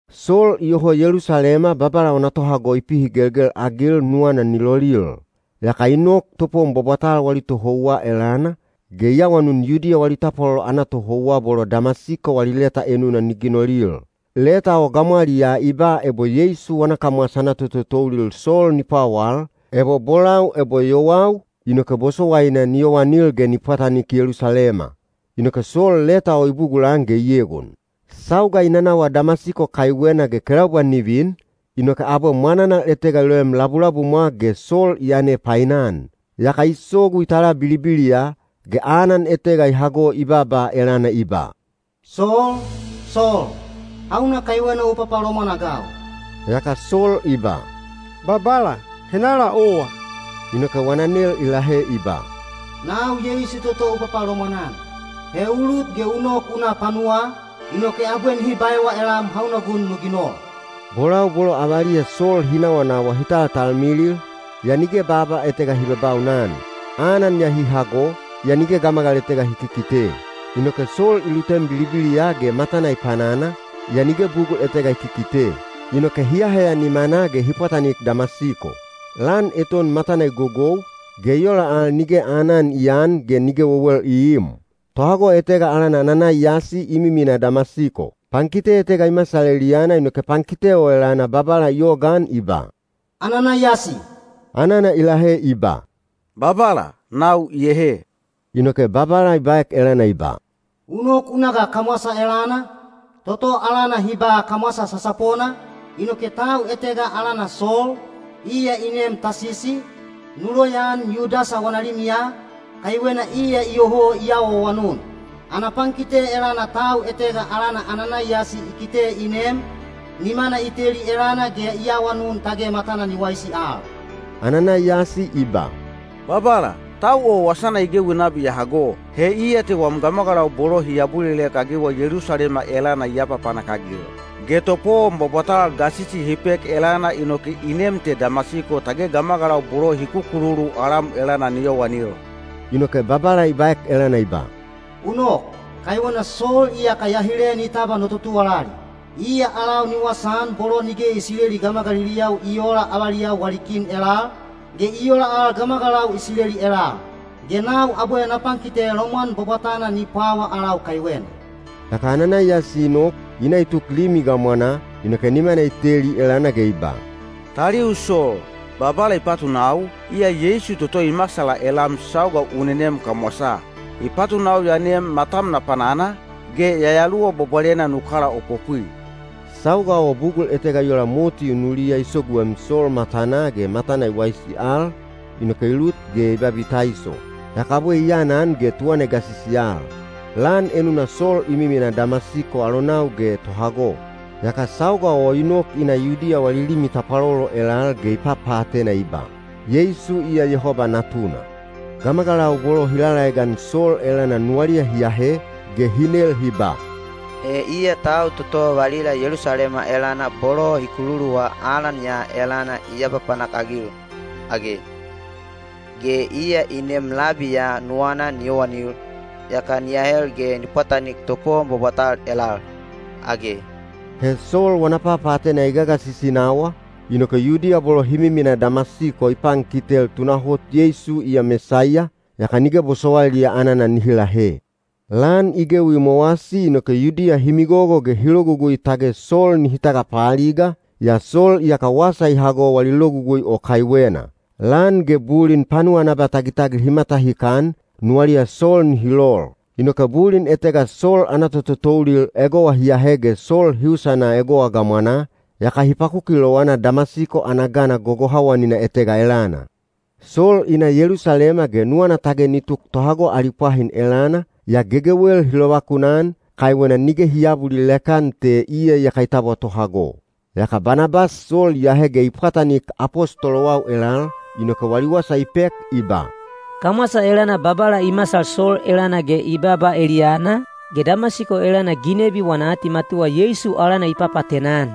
Sol iyoho Yelusalema Babala wana tohago i pihigelgel-agil nuwana ni lolil. Yaka i nok topowon bwabwatal wali tohouwa elana, ge i awanun Yudiya wali tapwalolo ana tohouwa bolo Damasiko wali leta enuna ni ginolil. Leta o gamwaliyaa i ba ebo Yeisu wana kamwasa ana tototoulil Sol ni pwawal, ebo bolau ebo yowau, inoke bosowaina ni yowanil ge ni pwatanik Yelusalema. Inoke Sol leta o i bugulan ge i egon. Sauga i nanawa Damasiko kaiwena ge kelaubwa ni vin, inoke abwe mwananal etega i loem labulabumwa ge Sol i yane painan. Yaka i sogu i tala bilibiliya, ge anan etega i hago i baaba elana i ba, “Sol, Sol! Hauna kaiwena u papalomwan-agau?” Yaka Sol i ba, “Babala, henala owa?” Inoke wana nel i lahe i ba, “Nau Yeisu toto u papalomwan-an. He u lut ge u nok u na panuwaa, inoke abwe nihi baewa elam hauna gun nu ginol.” Bolau bolo avaliya Sol hi nawanawa hi taltalmilil, yaa nige baaba etega hi babaunan. Anan ya hi hago, yaa nige gamagal etega hi kikite. Inoke Sol i lutem bilibiliya ge matana i panana, yaa nige bugul etega i kikite. Inoke hi aheya nimanaa ge hi pwatanik Damasiko. Lan eton matana i gogou, ge i ola al nige aanan i aan ge nige wewel i iim. Tohago etega alana Ananaiyasi i miminaa Damasiko. Pankite etega i masal eliyana inoke pankite o elana Babala i yogaan i ba, “Ananaiyasi!” Anana i lahe i ba, “Babala, nau iyehe.” Inoke Babala i baek elana i ba, “U nok u na ga kamwasa elana, toto alana hi ba ‘Kamwasa Sasapona,’ inoke tau etega alana Sol, iya i neem Tasisi, nu loyaan Yudasa wana limiya, kaiwena iya iyoho i awaawanun. Ana pankite elana tau etega alana Ananaiyasi i kite i nem, nimana i teli elana ge i awanun tage matana ni waisi al.” Ananaiyasi i ba, “Babala, tau o wasana i gewi nabi ya hago. He iya te wam gamagalau bolo hi abulilek-agiwa Yelusalema elana i apapanak-agil. Ge topowon bwabwatal gasisi hi pek elana inoke i nem te Damasiko tage gamagalau bolo hi kukululu alam elana ni yowanil.” Inoke Babala i baek elana i ba, “U nok, kaiwena Sol iyaka ya hile ni tabwa no totuwalali. Iya alau ni wasaan bolo nige Isileli gamagaliliyau i oola avaliyau wali kin elal, ge i ola al gamagalau Isileli elal. Ge nau abwe na pankite lomwan bwabwatana ni pwawa alau kaiwena.” Yaka Ananaiyasi i nok, i na i tuk limi gamwanaa, inoke nimana i teli elana ge i ba, “Taliu Sol, Babala i patunau, iya Yeisu toto i masala elam sauga u nenem kamwasaa. I patunau ya nem matam na panana, ge Yayaluwa Bwabwalena nu kalaopopwi.” Sauga o bugul etega i ola moti unuliya i soguem Sol matanaa ge matana i waisi al, inoke i lut ge i babitaiso. Yaka abwe i aanan ge tuwana i gasisi al. Lan enuna Sol i miminaa Damasiko alonau ge tohago. Yaka sauga o i nok i na Yudiya wali limi tapwalolo elal ge i papaatena i ba, “Yeisu iya Yehoba Natuna.” Gamagalau bolo hi lalaegan Sol elana nuwaliya hi ahe, ge hi nel hi ba, “He iya tau toto valila Yelusalema elana bolo hi kululuwa alan ya elana i apapanak-agil, age? Ge iya i nem labi ya nuwana ni yowanil, yaka ni ahel ge ni pwatanik topowon bwabwatal elal, age?” He Sol wana papaatena i gagasisi nawa, inoke Yudiya bolo hi miminaa Damasiko i pankitel tunahot Yeisu iya Mesaiya, yaka nige bosowailiya anana nihi lahe. Lan i gewi i mowasi inoke Yudiya hi migogo ge hi logugui tage Sol nihi tagapaaliga, yaa Sol iyaka wasa i hago wali logugui o kaiwena. Lan ge bulin panuwa ana abatagitagil hi matahikan, nuwaliya Sol nihi lol. Inoke bulin etega Sol ana tototoulil egowa hi ahe ge Sol hi usana egowa gamwanaa, yaka hi pakuki lowana Damasiko ana gana gogohawanina etega elana. Sol i na Yelusalema ge nuwana tage ni tuk tohago ali pwahin elana, yaa gegewel hi lovakunan, kaiwena nige hi aabulilek-an te iya iyaka i tabwa tohago. Yaka Banabas Sol i ahe ge i pwatanik apostolowau elal, inoke wali wasa i pek i ba, “Kamwasa elana Babala i masal Sol elana ge i baaba eliyana, ge Damasiko elana ginebi wana atimatuwa Yeisu alana i papaatena-an.”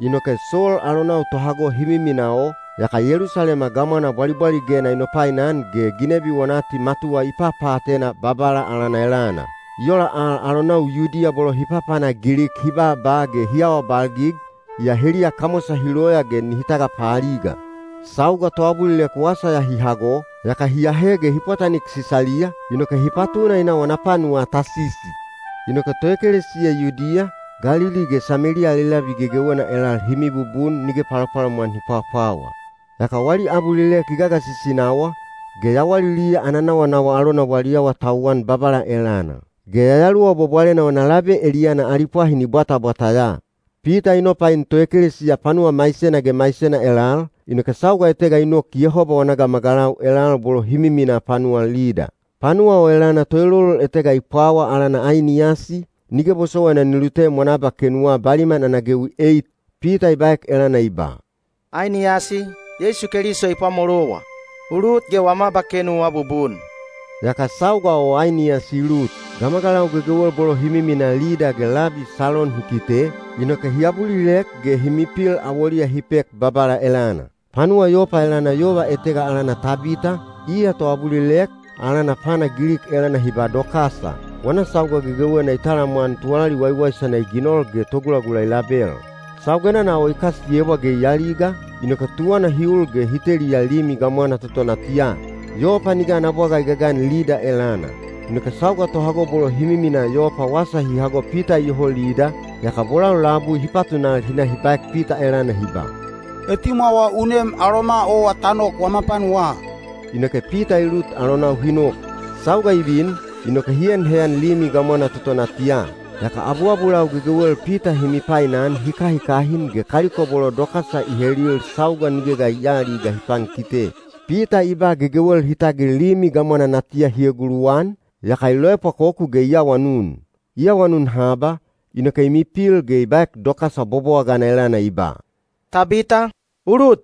Inoke Sol alonau tohago hi miminaa o, yaka Yelusalema gamwana bwalibwaligena i nopainan ge ginebi wana atimatuwa i papaatena Babala alana elana. I ola al alonau Yudiya bolo hi papana Gilik hi baaba ge hi awabalgig, yaa heliya kamwasa hi loya ge nihi tagapaaliga. Sauga toabulilek wasa ya hi hago, yaka hi ahe ge hi pwatanik Sisaliya, inoke hi patuna i na wana panuwaa Tasisi. Inoke toekelesiya Yudiya, Galili ge Sameliya ali labi gegewena elal hi mibubun nige palopalomwan hi pwapwawa. Yaka wali abulilek i gagasisi nawa, ge yawaliliya ana nawanawa alona wali awatauwan Babala elana. Ge Yayaluwa Bwabwalena wana labe eliyana ali pwahin i bwatabwata ya. Pita i nopain toekelesiya panuwa maisena ge maisena elal, inoke sauga etega i nok Yehoba wana gamagalau elal bolo hi miminaa panuwa Lida. Panuwa o elana toelolol etega i pwawa alana Ainiyasi, nige bosowaina ni lutem wana abakenuwa baliman ana gewi eit. Pita i baek elana i ba, “Ainiyasi, Yeisu Keliso i pwamolowa. U lut ge wam abakenu u abubun.” Yaka sauga o Ainiyasi i lut. Gamagalau gegewel bolo hi miminaa Lida ge labi Salon hi kite, inoke hi abulilek ge hi mipil awoliya hi pek Babala elana. Panuwa Yopa elana yova etega alana Tabita, iya toabulilek, alana Pana Gilik elana hi ba Dokasa. Wana sauga gegewena i talamwan tuwalali waiwaisana i ginol ge togulagula i label. Saugenana o i kasiyebwa ge i aliga, inoke tuwana hi ul ge hi teliya limi gamwana toto natiya. Yopa nige ana bwaga i gagan Lida elana. Inoke sauga tohago bolo hi miminaa Yopa wasa hi hago Pita iyoho Lida, yaka bolau labui hi patunal hi na hi baek Pita elana hi ba, “Etimwawa u nem aloma owa ta nok wama panuwaa.” Inoke Pita i lut alonau hi nok. Sauga i vin, inoke hi en heyan limi gamwana toto natiya. Yaka abuabulau gegewel Pita hi mipainan hi kahikahin ge kaliko bolo Dokasa i helil sauga nige ga i aaliga hi pankite. Pita i ba gegewel hi tagil limi gamwana natiya hi eguluwan, yaka i loepwakoku ge i awanun. I awanun haba, inoke i mipil ge i baek Dokasa bobowagana elana i ba, “Tabita, u lut.”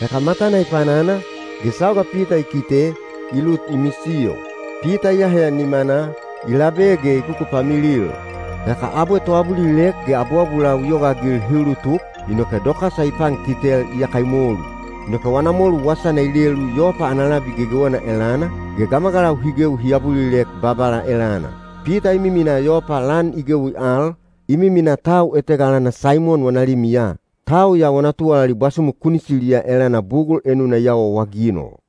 Yaka matana i panana, ge sauga Pita i kite, i lut i misiyo. Pita i aheya nimanaa, i labe ge i kukupamilil. Yaka abwe toabulilek ge abuabulau i yogaagil hi ulutuk, inoke Dokasa i pankitel iyaka i molu. Inoke wana molu wasana i lelu Yopa ana labi gegewena elana, ge gamagalau hi gewi hi abulilek Babala elana. Pita i miminaa Yopa lan i gewi al, i miminaa tau etega alana Saimon wana limiya. Tau ya wana tuwalali bwasumu kunisiliya elana bugul enuna i awaawaginol.